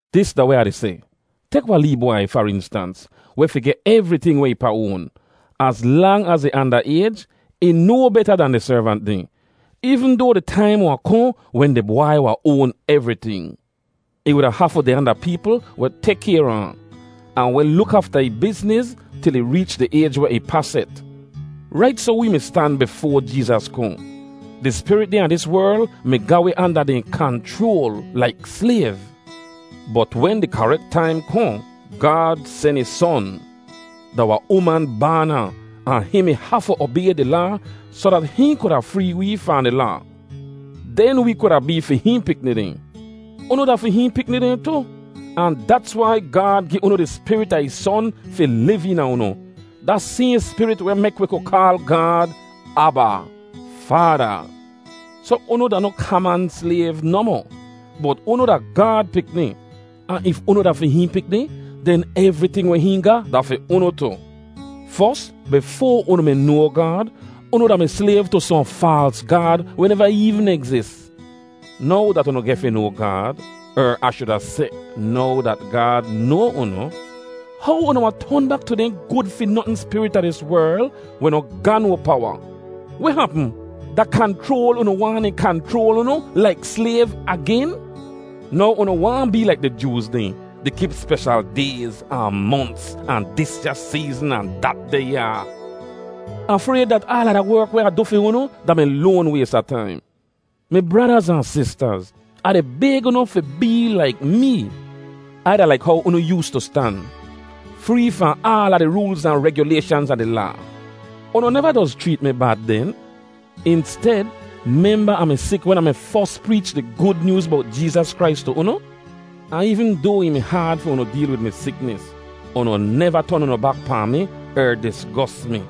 Dis da weh Ah di seh: Tek wahn lee bwai, far instans, weh fi geh evriting weh ih pa oan. Az lang az ih anda ayj, ih no beta dan di servant dehn, eevn doa di taim wahn kohn wen di bwai wahn oan evriting. Ih wuda hafu deh anda peepl weh tek kayr a ahn, ahn weh luk afta ih bizniz til ih reech di ayj weh ih pa set. Rait soh wee mi stan bifoa Jeezas kohn. Di spirit dehn a dis werl mi ga wi anda dehn kanchroal laik slayv. Bot wen di karek taim kohn, Gaad sen ih Son. Da wahn uman baan ahn, ahn hihn mi hafu obay di Laa soh dat hihn kuda free wee fahn di Laa. Den wee kuda bee fi hihn pikni dehn. Unu da fi hihn pikni dehn tu, ahn dats wai Gaad gi unu di Spirit a ih Son fi liv eena unu, da sayhn Spirit weh mek wi ku kaal Gaad, “Aba, Faada.” Soh unu da noh kaman slayv nohmoh, bot unu da Gaad pikni. Ahn if unu da fi hihn pikni, den evriting weh hihn ga da fi unu tu. Fos, bifoa unu mi noa Gaad, unu da-mi slayv tu sohn faals gaad weh neva eevn egzis. Now dat unu geh fi noa Gaad—er Ah shuda seh, now dat Gaad noa unu—how unu wahn ton bak tu dehn gud fi notn spirit a dis werl weh noh ga no powa? Weh hapm? Da kanchroal unu waahn dehn kanchroal unu laik slayv agen? Now unu waahn bee laik di Jooz dehn, di kip speshal dayz, ahn monts, ahn disya seezn ahn datdeh yaa. Ah frayd dat aala da werk weh Ah du fi unu da-mi loan ways a taim. Mi bradaz ahn sistaz, Ah di bayg unu fi bee laik mee. Ai da laik how unu yoostu stan, free fahn aala di roolz ahn regyulayshanz a di Laa. Unu neva doz chreet mi bad den. Insted, memba Ah mi sik wen Ah mi fos preech di Gud Nyooz bowt Jeezas Krais tu unu? Ahn eevn doa ih mi haad fi unu deel wid mi siknis, unu neva ton unu bak pahn mi er disgos mi.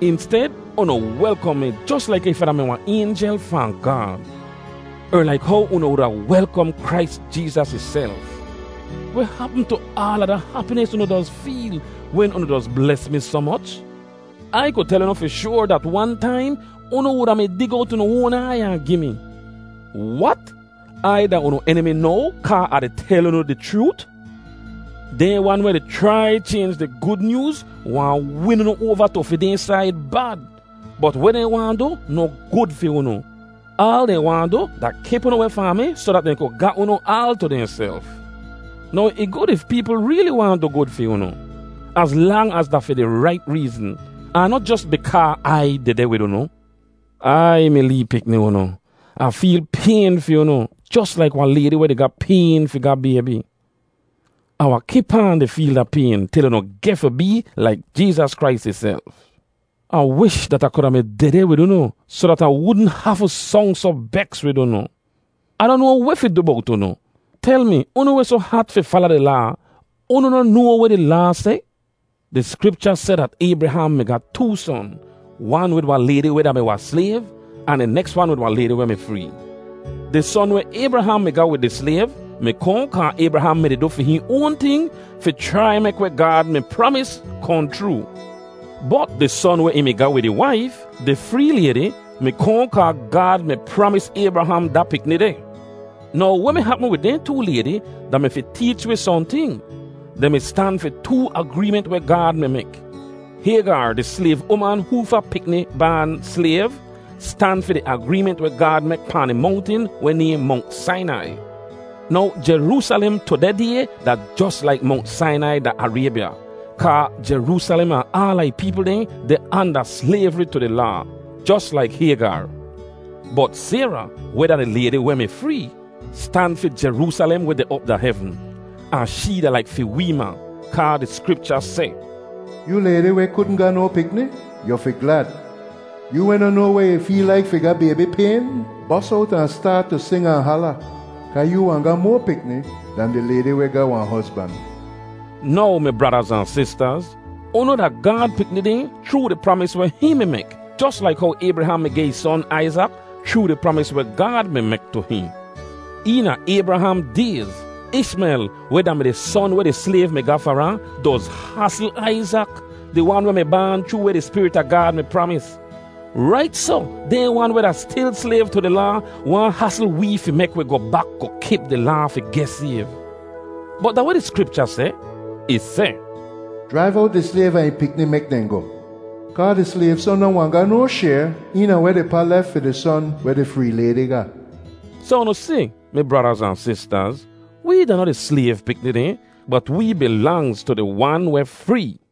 Insted, unu welkom mi jos laik if Ah da-mi wahn aynjel fahn Gaad, er laik how unu wuda welkom Krais Jeezas ihself. Weh hapm tu aala da hapinis unu doz feel wen unu doz bles mi soh moch? Ai ku tel unu fi shoar dat wan taim unu wuda mi dig owt unu oan aiy ahn gi mi. Wat, Ai da unu enimi now kaa Ah tel unu di chroot? Dehn wan weh di chrai chaynj di Gud Nyooz waahn win unu oava tu fi dehn said bad, bot weh dehn waahn du noh gud fi unu. Aal dehn waahn du da kip unu weh fahn mi soh dat dehn ku ga unu aal tu dehnself. Now ih gud if peepl reeli waahn du gud fi unu, az lang az da fi di rait reezn, ahn noh jos bikaa Ai dehdeh wid unu. Aiy, mi lee pikni unu! Ah feel payn fi unu jos laik wahn laydi weh di ga payn fi ga baybi. Ah wahn kip aan di feel da payn til unu geh fi bee laik Jeezas Krais ihself. Ah wish dat Ah kuda mi dehdeh wid unu soh dat Ah wudn hafu song soh beks wid unu. Ah noh noa weh fi du bowt unu. Tel mi, unu weh soh hat fi fala di Laa, unu noh noa weh di Laa seh? Di Skripcha seh dat Aybraham mi ga too son, wan wid wahn laydi weh da-mi wahn slayv, ahn di neks wan wid wahn laydi weh mi free. Di son weh Aybraham mi ga wid di slayv mi kohn kaa Aybraham mi-di du fi hihn oan ting fi chrai mek weh Gaad mi pramis kohn chroo. Bot di son weh ih mi ga wid ih waif, di free laydi, mi kohn kaa Gaad mi pramis Aybraham da pikni deh. Now weh mi hapm wid dehn too laydi da-mi fi teech wi sohnting. Dehn mi stan fi too agreement weh Gaad mi mek. Haygar, di slayv uman hoofa pikni baan slayv, stan fi di agreement weh Gaad mek pahn di mongtin weh nayhn Mongt Sainai. Now Jeroosalem tudeh day da jos laik Mongt Sainai da Araybya kaa Jeroosalem ahn aala ih peepl dehn deh anda slayvri tu di Laa, jos laik Haygar. Bot Sayra, weh da di laydi weh mi free, stan fi Jeroosalem weh deh op da hevn. Ahn shee da laik fi wee ma. Kaa di Skripcha seh, “Yoo laydi weh kudn ga no pikni, yu fi glad! Yoo weh noh noa weh ih feel laik fi ga baybi payn, bos owt ahn staat tu sing ahn hala; kaa yoo wahn ga moa pikni dan di laydi weh ga wahn hozban.” Now, mi bradaz ahn sistaz, unu da Gaad pikni dehn chroo di pramis weh hihn mi mek, jos laik how Aybraham mi geh ih son Aizak chroo di pramis weh Gaad mi mek tu hihn. Eena Aybraham dayz, Ishmel, weh da-mi di son weh di slayv mi ga far ahn, doz hasl Aizak, di wan weh mi baan chroo weh di Spirit a Gaad mi pramis. Rait soh, dehn wan weh da stil slayv tu di Laa waahn hasl wee fi mek wi goh bak goh kip di Laa fi geh sayv. Bot da weh di Skripcha seh? Ih seh, “Jraiv owt di slayv ahn ih pikni mek dehn goh; kaa di slayv son noh wahn ga no shayr eena weh di pa lef fi di son weh di free laydi ga.” Soh unu si, mi bradaz ahn sistaz, wee da noh di slayv pikni dehn, bot wee bilangz tu di wan weh free.